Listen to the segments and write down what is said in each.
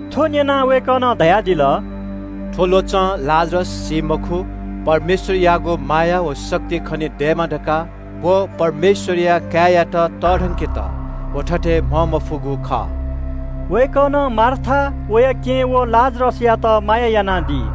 थ्व न्यनाः वय्कलं धयादिल – “थ्व ल्वचं लाजरस सी मखु। परमेश्वरयागु महिमाया निंतिं व परमेश्वरया काय्यात तःधंकेत व थथे म्हंमफुगु खः।” वय्कलं मार्था, वया केहेँ व लाजरसयात माया यानादी।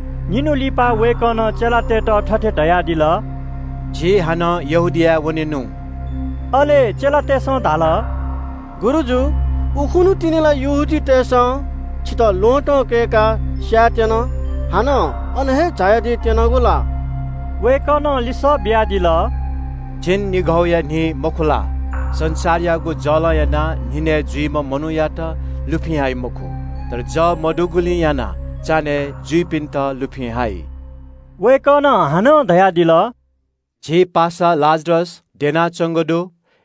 निन्हु लिपा वय्कलं चेलातय्त थथे धयादिल – “झी हानं यहूदियाय् लिहां वनेनु।” अले चेलातय्सं धाल – “गुरुजु, उखुन्हु तिनि ला यहूदीतय् नायःतय्सं छितः ल्वहँतं कय्काः स्यायेत्यन। हानं अन हे झायादी त्यनागु ला?” वय्कलं लिसः बियादिल – “छन्हुया झिंनिघौ दइगु मखु ला? संसारयागु जलं यानाः न्हिनय् जुइम्ह मनूयात लुफिं हाइ मखु। तर जः मदुगुलिं यानाः चान्हय् जुइपिन्त लुफिं हाइ।” वय्कलं हानं धयादिल – “झी पासा लाजरस द्यनाच्वंगु दु।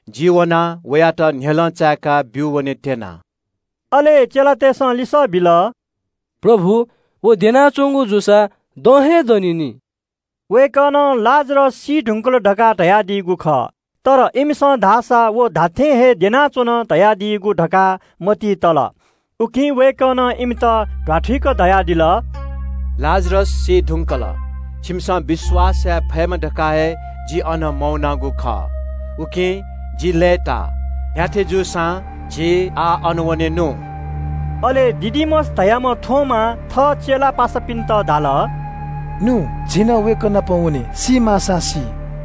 जि वयात न्ह्यलं चाय्का ब्यू वनेत्यना।” अले चेलातय्सं लिसः बिल – “प्रभु, व द्यनाच्वंगु जूसा दँ हे दनी नि।” वय्कलं लाजरस सी धुंकल धकाः धयादीगु खः। तर इमिसं धाःसा व धात्थें हे द्यनाच्वन धयादीगु धकाः मतिइ तल। उकिं वय्कलं इमित ध्वाथुइक धयादिल – “लाजरस सी धुंकल। छिमिसं विश्वास याये फयेमा धकाः हे जि अन मवनागु खः, उकिं जि लय्ताः। न्ह्याथे जूसां झी आः अन वनेनु।” अले दिदुमस धाःम्ह थोमां थः चेला पासापिन्त धाल – “नु, झी नं वय्कः नाप वने सी माःसां सी।”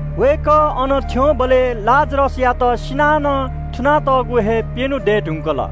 वय्कः अन थ्यंबलय् लाजरसयात सिनाः नं थुनातःगु हे प्यन्हु दये धुंकल।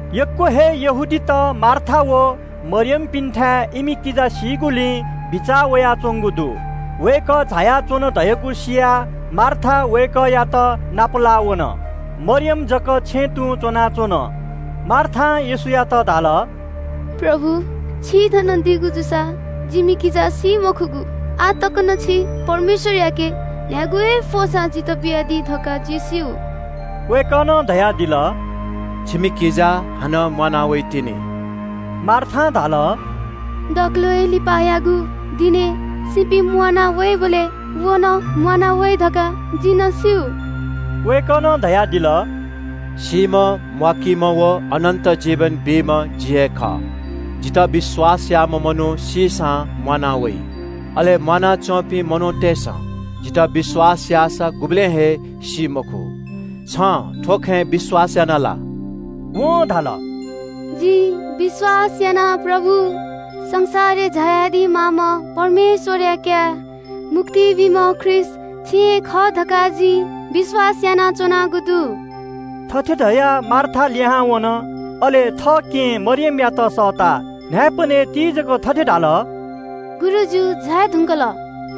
यक्व हे यहूदीत मार्था व मरियमपिन्थाय् इमि किजा सीगुलिं बिचाः वयाच्वंगु दु। वय्कः झायाच्वन धयागु सियाः मार्था वय्कःयात नापलाः वन। मरियम जक छेँय् तुं च्वनाच्वन। मार्थां येशूयात धाल – “प्रभु, छि थन दीगु जूसा जिमि किजा सी मखुगु। आः तक नं छिं परमेश्वरयाके न्ह्यागु हे फ्वंसां छितः बियादी धकाः जिं स्यू।” वय्कलं धयादिल – “छिमि किजा हानं म्वाना वइतिनि।” मार्थां धाल – “दकलय् लिपायागु दिनय् सीपिं म्वाना वइबलय् व नं म्वाना वइ धकाः जिं नं स्यू।” वय्कलं धयादिल – “सीम्ह म्वाकीम्ह व जीवन बीम्ह जि हे खः। जितः विश्वास याःम्ह मनू सीसां म्वाना वइ। अले म्वानाच्वंपिं मनूतय्सं जितः विश्वास याःसा गुबलें हे सी मखु। छिं थ्व खँय् विश्वास यानादिया ला?” वं धाल – “खः प्रभु, संसारय् झायादी माःम्ह परमेश्वरया काय्, मुक्ति बीम्ह ख्रीष्ट छि हे खः धकाः जिं विश्वास यानागु दु।” थथे धयाः मार्था लिहां वन। अले थः केहेँ मरियमयात सःताः न्हाय्पनय् तीजक थथे धाल – “गुरुजु झाये धुंकल,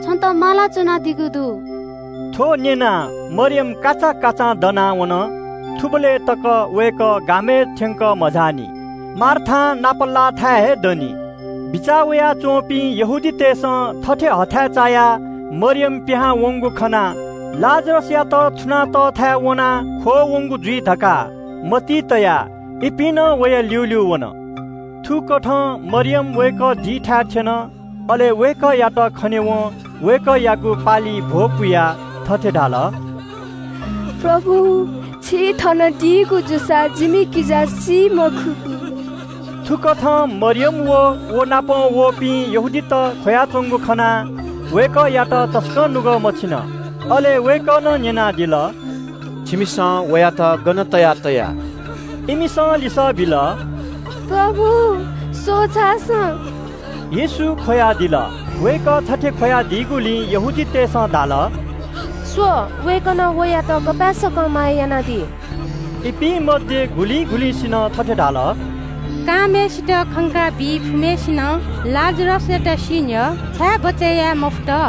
छन्त माला च्वनादीगु दु।” थ्व न्यनाः मरियम काचाकाचां दनाः वन। थुबलय् तक वय्कः गामय् थ्यंकः मझाःनि, मार्थां नापलाःगु थासय् हे दनि। बिचाः वयाच्वंपिं यहूदीतय्सं थथे हथाय् चायाः मरियम पिहां वंगु खनाः लाजरसयात थुनातःथाय् वनाः ख्वः वंगु जुइ धकाः मतिइ तयाः इपिं नं वया ल्यूल्यू वन। थुकथं मरियम वय्कः दीथाय् थ्यन, अले वय्कःयात खनेवं वय्कःयागु पालिइ भ्वपुयाः थथे धाल – “प्रभु, छि थन दीगु जूसा जिमि किजा सी मखुगु।” थुकथं मरियम अले व नाप वःपिं यहूदीत ख्वयाच्वंगु खनाः वय्कःयात तसकं नुगः मछिन। अले वय्कलं न्यनादिल – “छिमिसं वयात गन तयाः तया?” इमिसं लिसः बिल – “प्रभु, स्वः झासँ।” येशू ख्वयादिल। वय्कः थथे ख्वयादीगुलिं मनूतय्सं धाल – “स्व, वय्कलं वयात गपाय्सकं माया यानादी।” इपिं मध्ये गुलिं गुलिंसिनं थथे धाल – “कांम्हय्सित खंकाबी फुम्हय्सिनं लाजरसयात सी न्ह्यः छाय् बचय् याये मफुत?”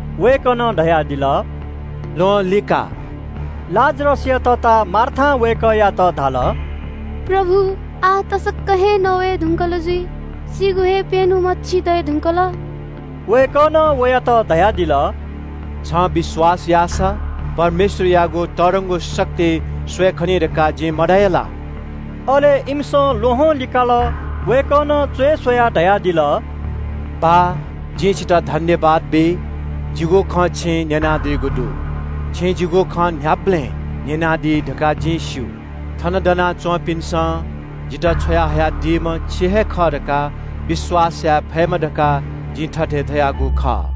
वय्कलं धयादिल – “ल्वहं चीकि।” लाजरसया तता मार्थां वय्कःयात धाल – “प्रभु, आः ला नवये धुंकल जुइ, सीगु हे प्यन्हु मछि दये धुंकल।” वय्कलं वयात धयादिल – “छिं विश्वास यानादीसा, परमेश्वरयागु तःधंगु महिमा स्वये खनी धकाः जिं मधया ला?” अले इमिसं ल्वहं चीकल। वय्कलं च्वय् स्वयाः धयादिल – “बाः, जिं छितः सुभाय् बी। जिगु खँ छिं न्यनादीगु दु। छिं जिगु खँ न्ह्याबलें न्यनादी धकाः जिं स्यू। थन दना च्वंपिन्सं जितः छ्वयाहयादीम्ह छि हे खः धकाः विश्वास याये फयेमा धकाः जिं थथे धयागु खः।”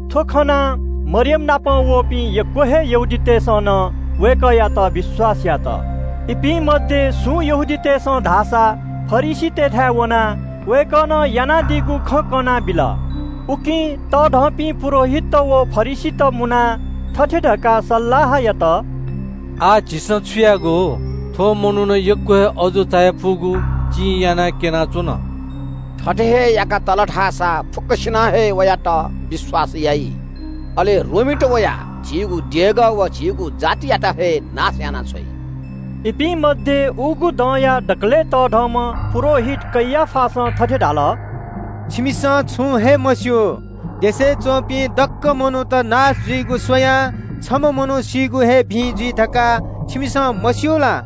थ्व खनाः मरियमनापं वःपिं यक्व हे यहूदीतय्सं नं वय्कःयात विश्वास यात। इपिं मध्ये सुं मनूतय्सं धाःसा फरिसीतय्थाय् वनाः वय्कलं यानादीगु खँ कनाबिल। उकिं तःधंपिं पुजाहारीत व फरिसीत मुनाः थथे धकाः सल्लाह यात– “आः झीसं छु यायेगु? थ्व मनुखं यक्व हे अजू चायापुगु चिं यानाः क्यनाच्वन। थथे हे याका तल धाःसा फुक्कसिनं हे वयात विश्वास याइ। अले रोमीत वयाः झीगु देगः व झीगु जातियात हे नाश यानाछ्वइ।” इपिं मध्ये उगु दँयाम्ह दकलय् तःधंम्ह पुजाहारी कैयाफां थथे धाल – “छिमिसं छुं हे मस्यू। देशय् च्वंपिं दक्व मनूत नाश जुइगु स्वयाः छम्ह मनू सीगु हे भिं जुइ धकाः छिमिसं मस्यू ला?”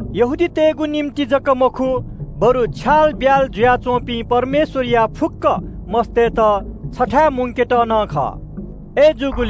यहूदीतय्गु निंतिं जक मखु, बरु छ्यालब्याल जुयाच्वंपिं परमेश्वरया फुक्क सन्तानतय्त छथाय् मुंकेत नं खः।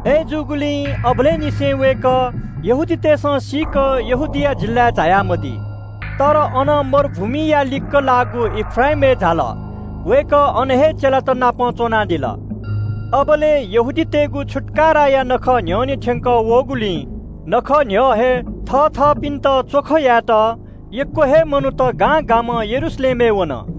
अय्जूगुलिं अबलय् निसें वय्कः यहूदीतय्सं खंक यहूदिया जिल्लाय् जुया मदी। तर अनं मरुभूमिया लिक्क लाःगु एफ्राइमय् झाल। वय्कः अन हे चेलात नाप च्वनादिल। अबलय् यहूदीतय्गु छुत्काराया नखः न्ह्यःने थ्यंकः वःगुलिं नखः न्ह्यः हे थःथपिन्त च्वख यायेत यक्व हे मनूत गां गामं यरूशलेमय् वन।